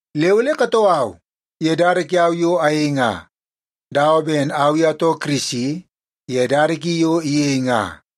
Le ole katoo au ye dada kiau yo ayei nga, dawa ben au i atoo Kirisi ye dada ki yo iyei nga.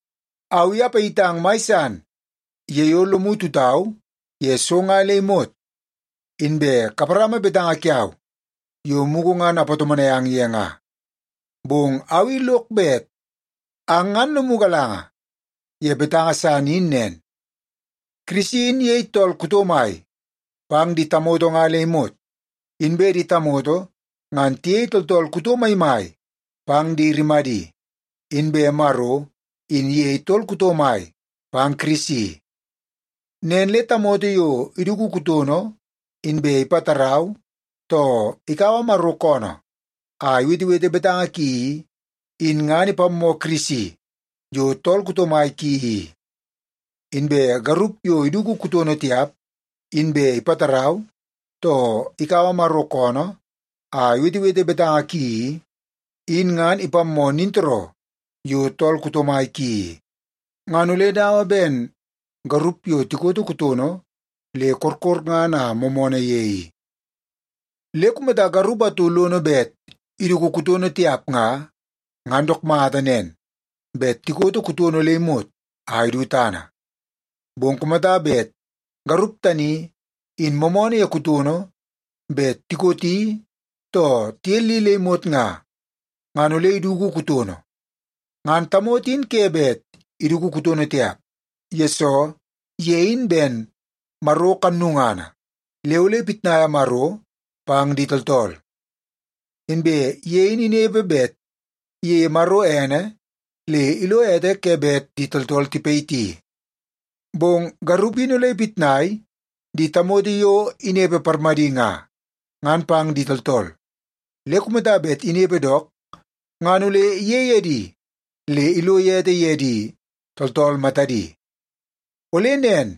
Au i apayitang mai san ye yo lomu tutau ye so nga le imot, inbe kaparama betanga kiau yo mugu ngan apatomonai ang ye nga. Bong au i lok bet ang ngan lomu galanga ye betanga san in nen. Kirisi in iyei tool kuto mai pang di tamoto nga le imot. Inbe di tamoto ngan tiyei tooltool kuto maimai pang di rimadi, inbe Maro in iyei tool kuto mai pang Kirisi. Nen le tamoto yo iduku kutono, inbe ipatarau, too ikaua Maro koonoo a iwetewete betanga ki i, in ngan ipammoo Kirisi yo tool kuto mai ki i. Inbe garup yo iduku kutono tiap, inbe ipatarau, too ikaua Maro koonoo a iwetewete betanga ki i, in ngan ipammoo nintooroo yo tool kuto mai ki i. Ngan ole dawa ben garup yo tikoto kutono le korkorngana a moomoonoo ye i. Le kumata garup atu lono bet iduku kutono tiap nga, ngan dook mata nen bet tikoto kutono le imot a idu tana. Bong kumata bet garup tani in moomoonoo ye kutono bet tikoti too tiyelli le imot nga, ngan ole iduku kutono. Ngan tamoto in ke bet iduku kutono tiap, yesoo ye in ben Maro kannungana le ole ipitnaia Maro pang di tooltool. Inbe ye in inepe bet iyeie Maro ene le ilo ete ke bet di tooltool tipayiti. Bong garup in ole ipitnai di tamoto yo inepe parmadi nga, ngan pang di tooltool. Le kumata bet inepe dook, ngan ole iyei edi le ilo ete ye di tooltool matadi. Ole nen,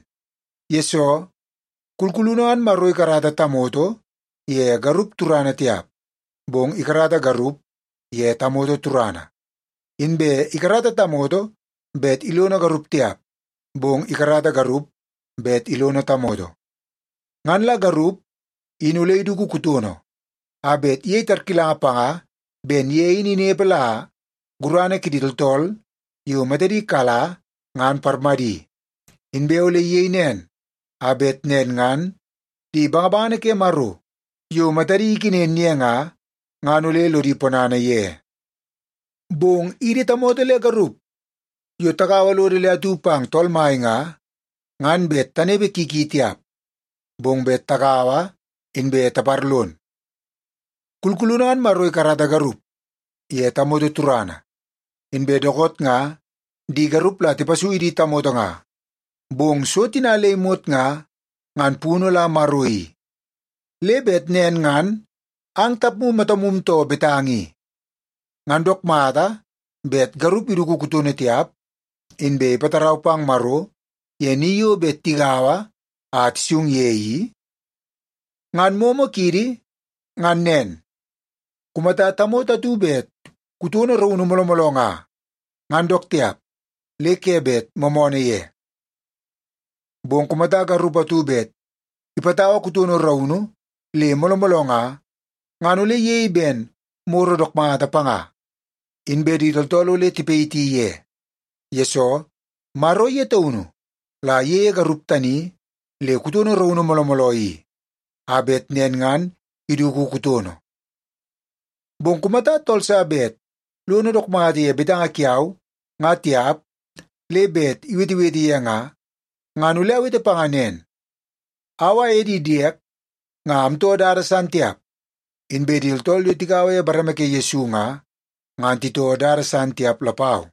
yesoo kulkulunu ngan Maro ikarata tamoto ye garup turana tiap, bong ikarata garup ye tamoto turana. Inbe ikarata tamoto bet ilono garup tiap, bong ikarata garup bet ilono tamoto. Ngan la garup in ole iduku kutono a bet iyei tarkilanga panga ben ye in inepe la gurana kidi tooltool yo matadi kala ngan parmadi. Inbe ole iyei nen, a bet nen ngan di bangabangana ke Maro yo matadi ikenen ye nga, ngan ole lodi ponana ye. Bong idi tamoto le garup yo tagaua lodo le atu pang Tool Mai nga, ngan bet tanepe ki ki tiap, bong bet tagaua inbe taparlon. Kulkulunu ngan Maro ikarata garup ye tamoto turana. Inbe dookoot nga di garup la tipasui di tamoto nga. Bong so tina le imot nga, ngan punu la Maro i. Le bet nen ngan ang tapmu matamu too betanga i. Ngan dook mata bet garup iduku kutono tiap, inbe ipatarau pang Maro ye ni yo bet tigaua a tisung ye i? Ngan momo kiidi ngan nen, kumata tamoto atu bet kutono raunu mooloo mooloo nga, ngan dook tiap le ke bet moomoonoo ye. Bong kumata garup atu bet ipatau kutono raunu le mooloo mooloo nga, ngan ole iyei ben moro dook mata panga, inbe di tooltool ole tipayiti ye. Yesoo, Maro ye taunu la iyeie garup tani le kutono raunu mooloo mooloo i, a bet nen ngan iduku kutono. Bong kumata tool sa bet lono dook mata ye betanga kiau nga tiap le bet iwetewete ye nga, ngan ole awete panga nen. Au aye di diek nga amtoo dada san tiap, inbe di tooltool yo tigaua ye bareme ke Yesu nga, ngan titoo dada san tiap lapau.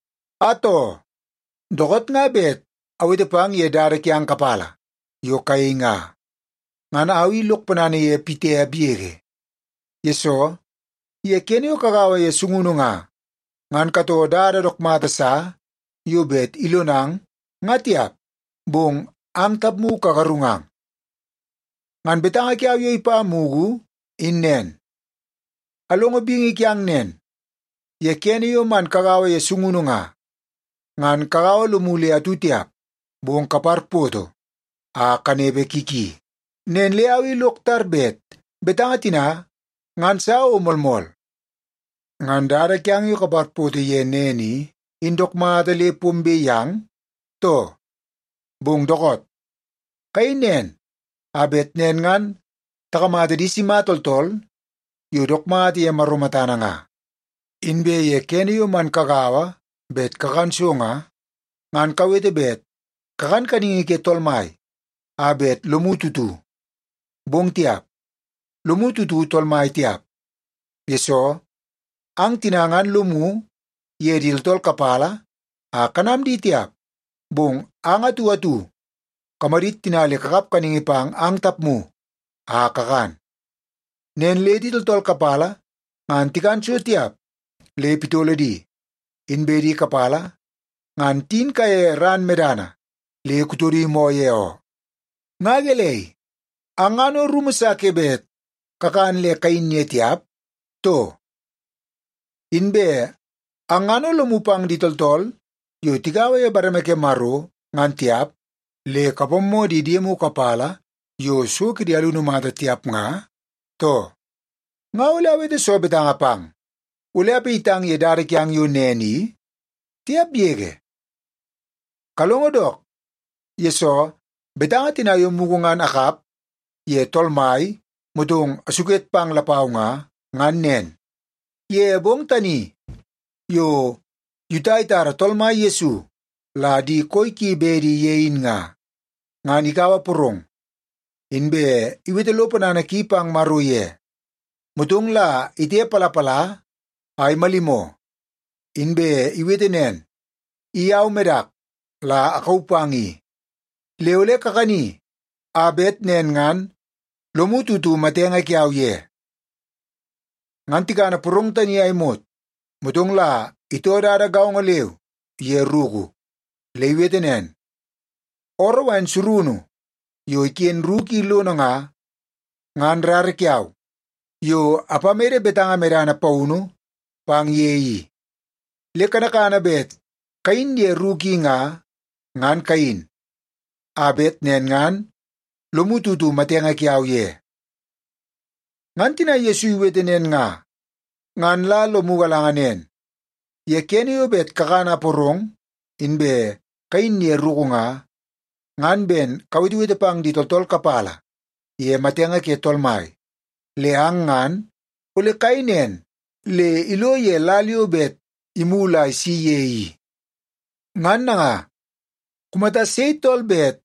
Atoo, dookoot nga bet awete pang ye dada kiang kapala yo kayei nga, ngan au i lok ponana ye pitiap yege. Yesoo, ye kene yo kagaua ye sungunu nga, ngan katoo dada dook mata sa yo bet ilonang nga tiap, bong ang tapmu kagarungang. Ngan betanga kiau yo ipa mugu in nen. Alongo bingi kiang nen, ye kene yo man kagaua ye sungunu nga, ngan kagaua lomu le atu tiap, bong kaparpoto a kanepe ki ki. Nen le au i lok tar bet betanga tina ngan sa o moolmool. Ngan dada kiang yo kaparpoto ye nen i, in dook mata le pombe yang, too? Bong dookoot, kayei nen a bet nen ngan takamata di sima tooltool yo dook mata ye Maro matana nga. Inbe ye kene yo man kagaua bet kakan so nga, ngan kawete bet kakana kaningi ke Tool Mai a bet lomu tutu. Bong tiap, lomu tutu Tool Mai tiap, yesoo ang tina ngan lomu ye di tooltool kapala a kanam di tiap, bong ang atu atu kamadit tina le kakap kaningi pang ang tapmu a kakan. Nen le di tooltool kapala ngan tikan so tiap le pitolo di, inbe di kapala ngan tiyin kaiye ran medana le kutodi moo ye oo. Nga gelei, ang ngan o rumu sa ke bet kakan le kayin ye tiap, too? Inbe ang ngan o lomu pang di tooltool yo tigaua ye bareme ke Maro ngan tiap, le kapammoo di diemu kapala yo so kidi alunu mata tiap nga, too? Nga ole awete soo betanga pang? Ole apayitang ye dada kiang yo nen i? Tiap yege! Kalongo dook, yesoo betanga tina yo mugu ngan akap ye Tool Mai motong asuket pang lapau nga, ngan nen. Ye bong tani yo Yuta itara Tool Mai Yesu la di koi ki bedi ye in nga, ngan ikaua porong, inbe iwete lo ponana ki pang Maro ye. Motong la itepalapala a imalimoo, inbe iwete nen, “I au medak la akauu pang i. Le ole kakani a bet nen ngan lomu tutu matenge kiau ye.” Ngan tikana porong tani a imot, motong la itoo dada gaongo leu ye ruku. Le iwete nen, “Ooroo wain surunu yo iken ruku i lono nga, ngan rara kiau yo apamede betanga medana paunu pang ye i. Le kanakana bet kayin ye ruku i nga, ngan kayin a bet nen ngan lomu tutu matenge kiau ye.” Ngan tina Yesu iwete nen nga, ngan la lomu galanga nen: Ye kene yo bet kakana porong, inbe kayin ye ruku nga, ngan ben kawetewete pang di tooltool kapala ye matenge ke Tool Mai. Le ang ngan ole kayei nen le ilo ye lal yo bet imulu a isi ye i. Ngan nanga, kumata sei tool bet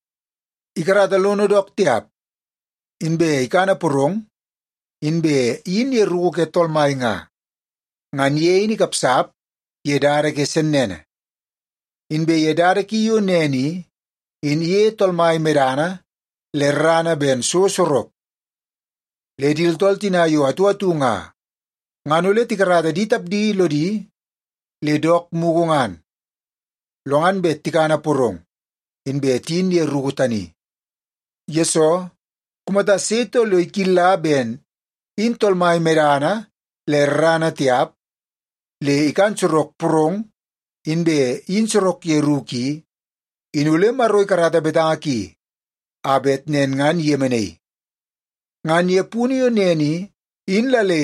ikarata lono dook tiap, inbe ikana porong, inbe iyin ye ruku ke Tool Mai nga, ngan ye in ikapsap ye dada ke sennene. Inbe ye dada ki yo nen i, in iyeie Tool Mai medana le rarana ben so sorok. Le di tooltool tina yo atu atu nga, ngan ole tikarata di tapdi lodi le dook mugu ngan, lo ngan bet tikana porong, inbe tiyin ye ruku tani. Yesoo, kumata sei tool yo ikilla ben in Tool Mai medana le rarana tiap, le ikan sorok porong, inbe iyin sorok ye ruku i, in ole Maro ikarata betanga ki a bet nen ngan iyemenaii. Ngan ye punu yo nen i, in la le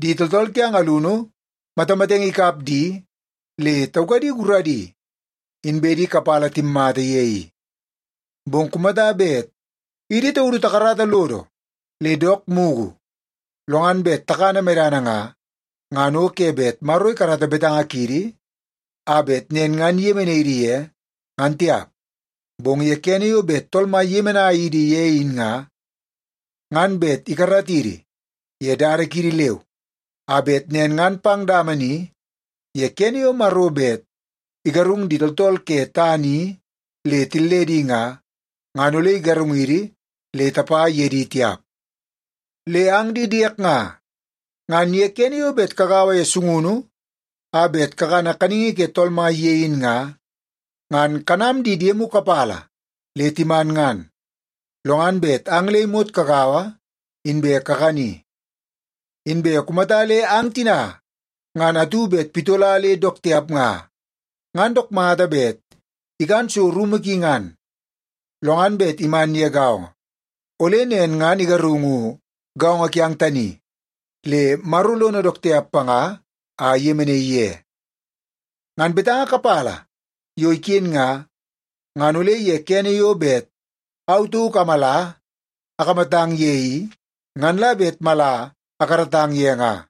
di tooltool kiang alunu matamatenge ikap di le taukadi guradi, inbe di kapala timmata ye i. Bong kumata bet idi taudu takarata lodo le dook mugu, lo ngan bet takana medana nga, ngan o ke bet Maro ikarata betanga kiidi a bet nen ngan iyemenai idi ye, ngan tiap. Bong ye kene yo bet Tool Mai iyemenai idi ye in nga, ngan bet ikaratidi ye dada kiidi leu, a bet nen ngan pang dama ni ye kene yo Maro bet igarung di tooltool ke tana i le tilledi nga, ngan ole igarungidi le tapa ye di tiap. Le ang di diek nga, ngan ye kene yo bet kagaua ye sungunu a bet kakana kaningi ke Tool Mai ye in nga, ngan kanam di diemu kapala le timan ngan, lo ngan bet ang le imot kagaua inbe kakani. Inbe kumata le ang tina ngan atu bet pitola le dook tiap nga, ngan dook mata bet ikan so rumu ki ngan, lo ngan bet iman ye gaongo. Ole nen ngan igarungu gaongo kiang tani, le Maro lono dook tiap panga a iyemenaii ye. Ngan betanga kapala yo iken nga, ngan ole ye kene yo bet au tauk amala akamatang ye i, ngan la bet mala akaratang ye nga.